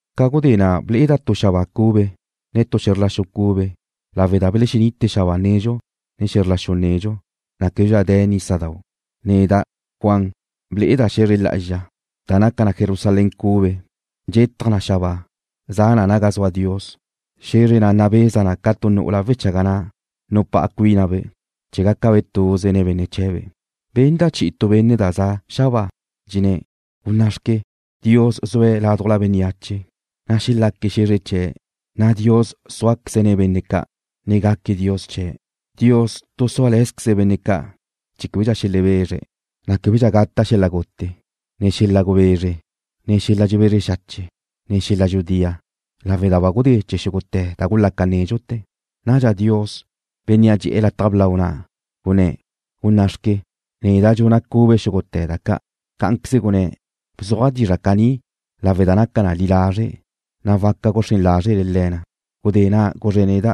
Ca gudé na' ble'eda' tu xabáa cube, ne tu xe̱zr la xu cube, lawe' da belexenite xabáa nedxu, ne xe̱zr la xu nedxu, na' québedxa de̱ nísadau'. Neda', Juan, ble'eda' xe̱zre lá'azxa, da naca na Jerusalén cube, dxetaj na xabáa, za na naga zua Dios. Xe̱zre na' nabeza na ca tu nu'ula wechaga na' nupá'a cuínabe' chee̱ gácabe' tuze nen benne' chee̱be'. Benda' chi'i tu benne' da za' xabáa, dxenné̱': ―Gunná'xque, Dios zue̱' ládujla bénneache, na' xelaque̱' xe̱zre chee̱', na' Dios súaqueze̱' nen benne' ca', ne gaque̱' Dios chee̱'. Dios tu súale̱zqueze̱' benne' ca' chee̱ québedxa xelebezre̱', na' québedxa gata' xel-la' gute, ne xel-la' gubezre, ne xel-la' dxebezre xache', ne xel-la' dxudía, lawe' da ba gudé chee̱ xúgute̱ da gulaca nédxute̱. Nadxa Dios, Bénnea' dxe'e̱ lataj blau na' gunné̱': ―Gunná'xque, neda' dxuna' cube xúgute̱ da ca'. Cá'anqueze gunné̱': ―Bzuaj dizra' caní lawe' da naca li lazre', na' waca guxrén lázrele le̱ na. Gudé na' guzre̱' neda':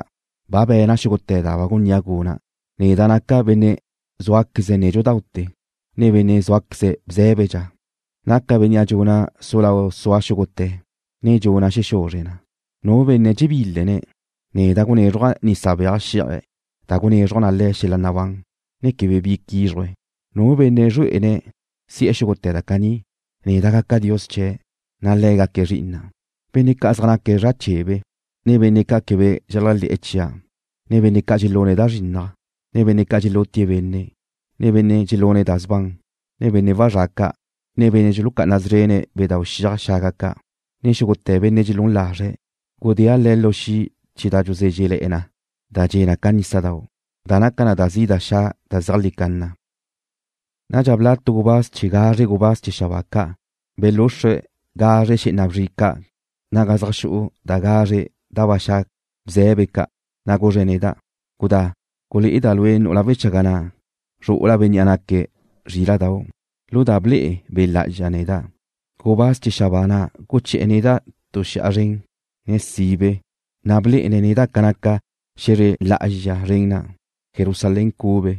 ―Ba be̱na' xúgute̱ da ba gunnía' guna'. Neda' naca' Benne' zúaqueze̱' nédxudaute̱, ne Benne' zúaqueze̱' bzé̱bedxa. Naca' Bénnea' dxuna' su lau sua xúgute̱, ne dxuna' xexuzre na. Nu benne' dxebílene̱', neda' gunézruja' nisa beaj xí'aje̱' da gunezruj na le̱' xel-la' nabán, ne quebe bi quízruje̱'. Nu benne' zrue'ene̱' si'e̱ xúgute̱ da caní, neda' gaca' Dios chee̱', na' le̱' gaque̱' zri'ina'. Benne' ca' zaj naque̱' zra' chebe, ne benne' ca' quebe dxeléajle̱'e̱ chia', ne benne' ca' dxelune̱' da zrinnaj, ne benne' ca' dxelutie̱' benne', ne benne' dxelune̱' da sban, ne benne' wazrá' ca', ne benne' dxulucá'ana szrene̱' bedau' xiaj xaga ca', ne xúgute̱ benne' dxelún lazre̱', gudéa' le̱' lu xi' chee̱ da dxuzézrele̱'e na da dxe' ca nísadau', da naca na da zi' da xa' da zeajlí canna. Nadxa bla' tu gubáz chee̱ gazre gubáz chee̱ xabáa ca' belúxrue̱' gazre xé'ena bzri ca' naga zaj xu'u da gazre da ba xa' bze̱be ca', na' guzre̱' neda': ―Gudá. Gulé'eda' lue' nu'ula wechaga na', zru'ula Bénnea' naque̱' Zríla'dau'. Lu da ble'e Be' Lá'azxa neda', gubáz chee̱ xabáa na' guché̱'e̱ neda' tu xi'a zren, ne sibe, na' blé'ene̱' neda' ca naca xe̱zre lá'azxa zren na', Jerusalén cube.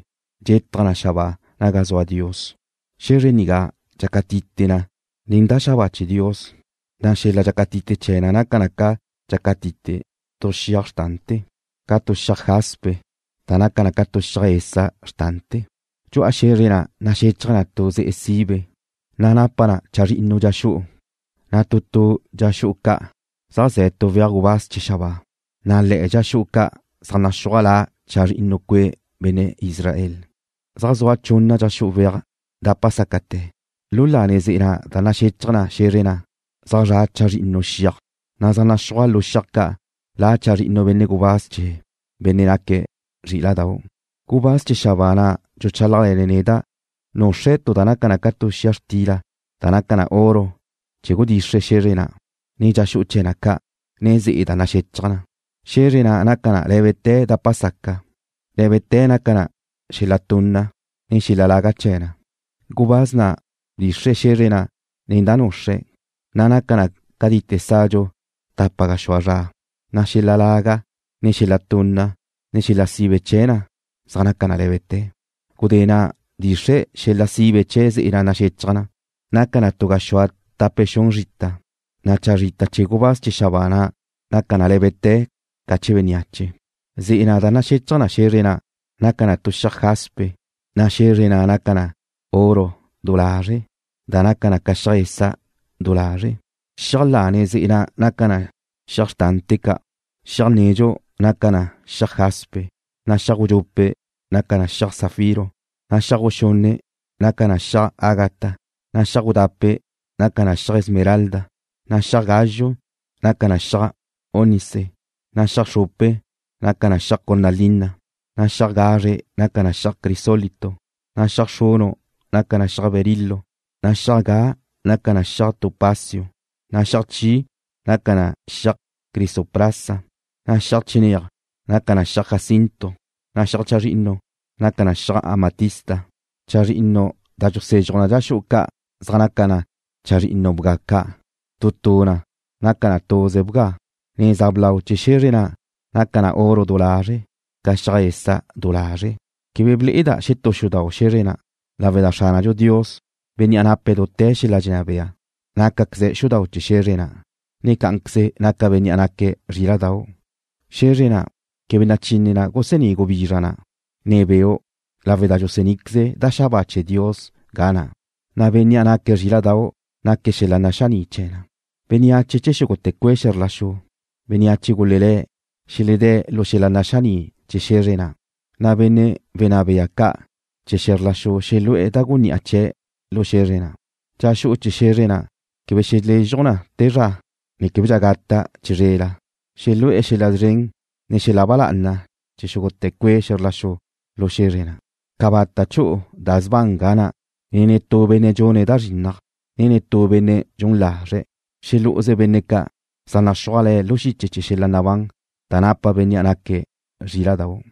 Dxetaj na xabáa naga zua Dios. Xe̱zre nigá dxácatite na nen da xabáa chee̱ Dios, na' xel-la' dxácatite chee̱ na naca na ca dxácatite tu xiaj xrtante̱, ca tu xiaj jaspe, da naca na ca xiaj esa' xrtante̱. Dxu'a xe̱zre na' naxechaj na tu ze'e sibe, na' napa na chazrinnu dxa xu'u, na' tu tu dxa xu'u ca' zaj ze̱ tu weaj gubáz chee̱ xabáa, na' le̱'e̱ dxa xu'u ca' zaj naxúaj la chazrinnu cue' benne' Israel. Zaj zua chunna dxa xu'u weaj dapa sácate̱. Lu lane ze'e da naxechaj na xe̱zre na' zaj zra' chazrinnu xiaj, na' zaj naxúaj lu xiaj ca' la chazrinnu benne' gubáz chee̱ Bénnea' naque̱' Zríla'dau'. Gubáz chee̱ xabáa na' dxuchálajle̱ne̱' neda' nuxre̱' tu da naca na ca tu xia xtila da naca na oro chee̱ gudxixre̱' xe̱zre na', ne dxa xu'u chee̱ na ca', ne ze'e da naxechaj na. Xe̱zre na' naca na lé̱bete̱ dapa saca. Lé̱bete̱ naca na xel-la' tunna, ne xel-la' laga chee̱ na. Gubáz na' bdxixre̱' xe̱zre na' nen da nuxre̱', na' naca na laga catite̱ sadxu tapa gaxúa zra, na' xel-la' laga, ne xel-la' tunna, ne xel-la' sibe chee̱ na zaj naca na lé̱bete̱. Gudé na' bdxixre̱' xel-la' sibe chee̱ ze'e na' naxechaj na. Naca na tu gaxúa tape xun zrita, na' chazrita chee̱ gubáz chee̱ xabáa na' naca na lé̱bete̱ ca chee̱ bénneache. Ze'e na' da naxechaj na xe̱zre na' naca na xiaj jaspe, na' xe̱zre na' naca na oro du lazre', da naca na ca xiaj esa' du lazre'. Xiaj lane ze'e na' zaj naca na xiaj xrtante̱ ca': Xiaj nedxu naca na xiaj jaspe, na' xiaj gudxupe' naca na xiaj zafiro, na' xiaj guxunne' naca na xiaj ágata, na' xiaj gudape' naca na xiaj esmeralda, na' xiaj gázxue naca na xiaj ónice, na' xiaj xrupe naca na xiaj cornalina, na' xiaj gazre naca na xiaj crisólito, na' xiaj xrunu' naca na xiaj berilo, na' xiaj ga naca na xiaj topacio, na' xiaj chi naca na xiaj crisoprasa, na' xiaj chinéaj naca na xiaj jacinto, na' xiaj chazrinnu naca na xiaj amatista. Chazrinnu da dxusezxuj na dxa xu'u ca' zaj naca na chazrinnu bga ca'. Tu tu na naca na tuze bga. Neza blau chee̱ xe̱zre na' naca na oro du lazre', ca xiaj esa' du lazre'. Quebe ble'eda' netú xudau' xe̱zre na', lawe' da Xránadxu Dios, Bénnea' nape̱' dute̱ xel-la' dxenná bea, nácaqueze̱' xudau' chee̱ xe̱zre na', ne cá'anqueze naca Bénnea' naque̱' Zríla'dau'. Xe̱zre na' quebe nachine na gusení' gubizra na', ne beu', lawe' da dxusení'queze da xabáa chee̱ Dios ga na', na' Bénnea' naque̱' Zríla'dau' naque̱' xel-la' naxaní' chee̱ na. Bénneache chee̱ xúgute̱ cue' xe̱zr la xu, bénneache gulelé̱', xeledé̱' lu xel-la' naxaní' chee̱ xe̱zre na', na' benne' wenná bea ca' chee̱ xe̱zr la xu xelu'e̱ da gunni'a chee̱' lu xe̱zre na'. Dxa xu'u chee̱ xe̱zre na' quebe xelezxuj na te zra, na' québedxa gata' chizrela. Xelu'e̱ xel-la' szren, ne xel-la' ba lá'ana chee̱ xúgute̱ cue' xe̱zr la xu lu xe̱zre na'. Cabata' chu'u da sban ga na', ne netú benne' dxune̱' da zrinnaj, ne netú benne' dxun lazre'. Xelú'uze benne' ca' zaj naxúaj le̱' lu xiche chee̱ xel-la' nabán da napa Bénnea' naque̱' Zríla'dau'.